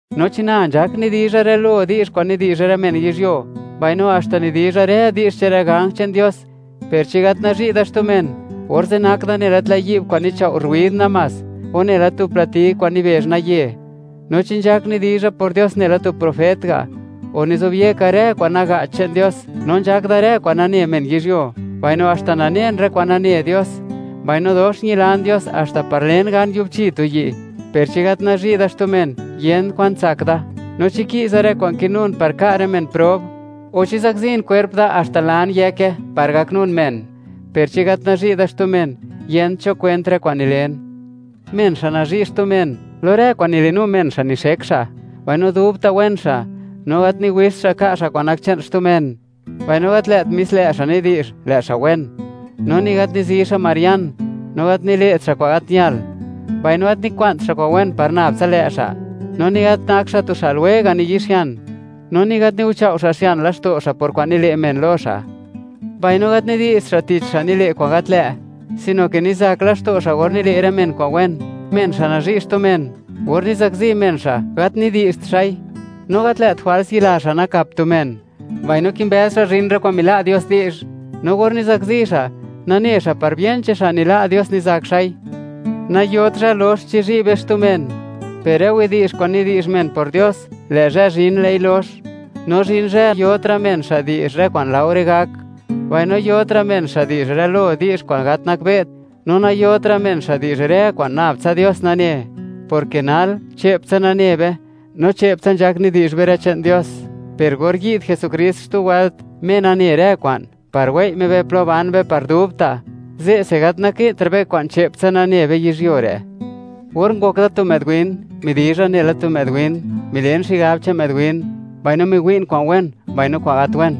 No chi na, nzhak nidizha rë lo di'zh kwa'n nidi'zh rë men yizhyuo, mbaino haxta nidizha rë di'zh che'n rë ganj che'n Dios, per chi gat nazhi' da xtu men, orze' nak da nela tlë' yi'b kwa'n nichao' ruid namás, o nela tu plati kwa'n nibezh naye. No chi nzhak nidizha por Dios, nela tu profet ga', o nizobyeka rë kwa'n naga'ch che'n Dios, no nzhak da rë kwa'n nane men yizhyuo, mbaino haxta nanen rë kwa'n nane Dios; mbaino dox ñilan Dios haxta par len gan yubchi tu yi', per chi gat nazhi' da xtu men, yent kwa'n tsak da. No chi ki'za rë kwa'n kinun par ka' rë men prob, o chi zakzin kwerp da haxta lan yëke par gaknun men, per chi gat nazhi' da xtu men, yent cho kwent rë kwa'n nilen. Men xa' nazhi' xtu men, lo rë kwa'n nilinu men xa' nixek xa', mbaino dubta' wen xa'; no gat niwixt xa' ka' xa' kwa'n nak che'n xtu men, mbaino gat lë't mis lë' xa' nidi'zh, lë' xa' wen; no ni gat nizi xa' marian. No gat nile't xa' kwa'n gat ñal, mbaino gat nikwa'nt xa' kwa'n wen par nab tsa lë' xa'; no ni gat nak xa' tu xa' lwega' niyi'xian, no ni gat niguchao' xa' xian laxto' xa' por kwa'n nile' men lo xa'. Mbaino gat nidi'zht xa' tich rë xa' nile' kwa'n gat lë', sino ke nizak laxto' xa' or nile' rë men kwa'n wen. Men xa' nazhi' xtu men, or nizakzi men xa', gat nidi'zht xa'i; no gat lë't jwals yila xa' nakap tu men, mbaino kimbëz xa' zhin rë kwa'n mila' Dios di'zh; no or nizakzi xa', nane xa' par bien che'n xa' nila' Dios nizak xa'i. Nayot zhë lox, chizhi' be xtu men, per rë widi'zh kwa'n nidi'zh men por Dios, lë' zhë zhin, lë'i lox; no zhin zhë yotra' men xa' di'zh rë kwa'n laore gak; mbaino yotra' men xa' di'zh rë lo di'zh kwa'n gat nakbe't, no nayotra' men xa' di'zh rë kwa'n nab tsa Dios nane, porke nal, che'ptsa nane be, no che'ptsa nzhak nidi'zh be rë che'n Dios, per or yi'd Jesukrist xtu wëlt, Me nane rë kwa'n, par wei' Me be plo ban be par dubta', ze'se gat naki'ntra' be kwa'n che'ptsa nane be yizhyuo re'. Or ngok da tu më'd win, midizha nela tu më'd win, milen xigab che'n më'd win, mbaino miwi'n kwa'n wen mbaino kwa'n gat wen,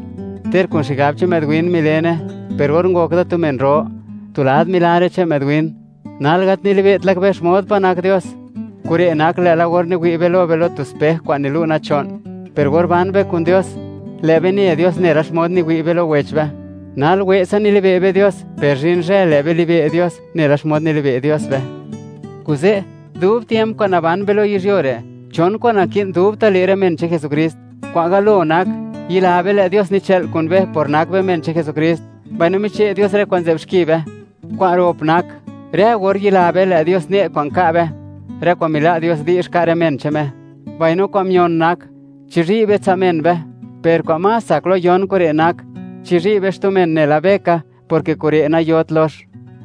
ter kun xigab che'n më'd win milene; per or ngok da tu men ro, tu lad milan rë che'n më'd win. Nal gat nilibe't laka be xmod pa' nak Dios. Kure' nak lë'la or niwi' be lo be, lo tu spej kwa'n nilu' nacho'n; per or ban be kun Dios, lë' be ne Dios nela xmod niwi' be lo wech be; nal we'tsa nilibe' be Dios, per zhin zhë, lë' be libe' Dios nela xmod nilibe' Dios be. Kuze', dub tiemp kwa'n naban be lo yizhyuo re', chon kwa'n naki'n dubta' le' rë men che'n Jesukrist. Kwa'n galo nak, yila be, lë' Dios nichë'l kun be, por nak be men che'n Jesukrist; mbaino miche' Dios rë kwa'n nzë'b xki be. Kwa'n rop nak: rë or yila be, lë' Dios ne' kwa'n ka' be, rë kwa'n mila' Dios di'zh, ka' rë men che'n Me. Mbaino kwa'n mion nak: Chizhi' be tsa' men be. Per kwa'n más tsak lo yon kure' nak, chizhi' be xtu men nela be ka, porke kure' nayot lox.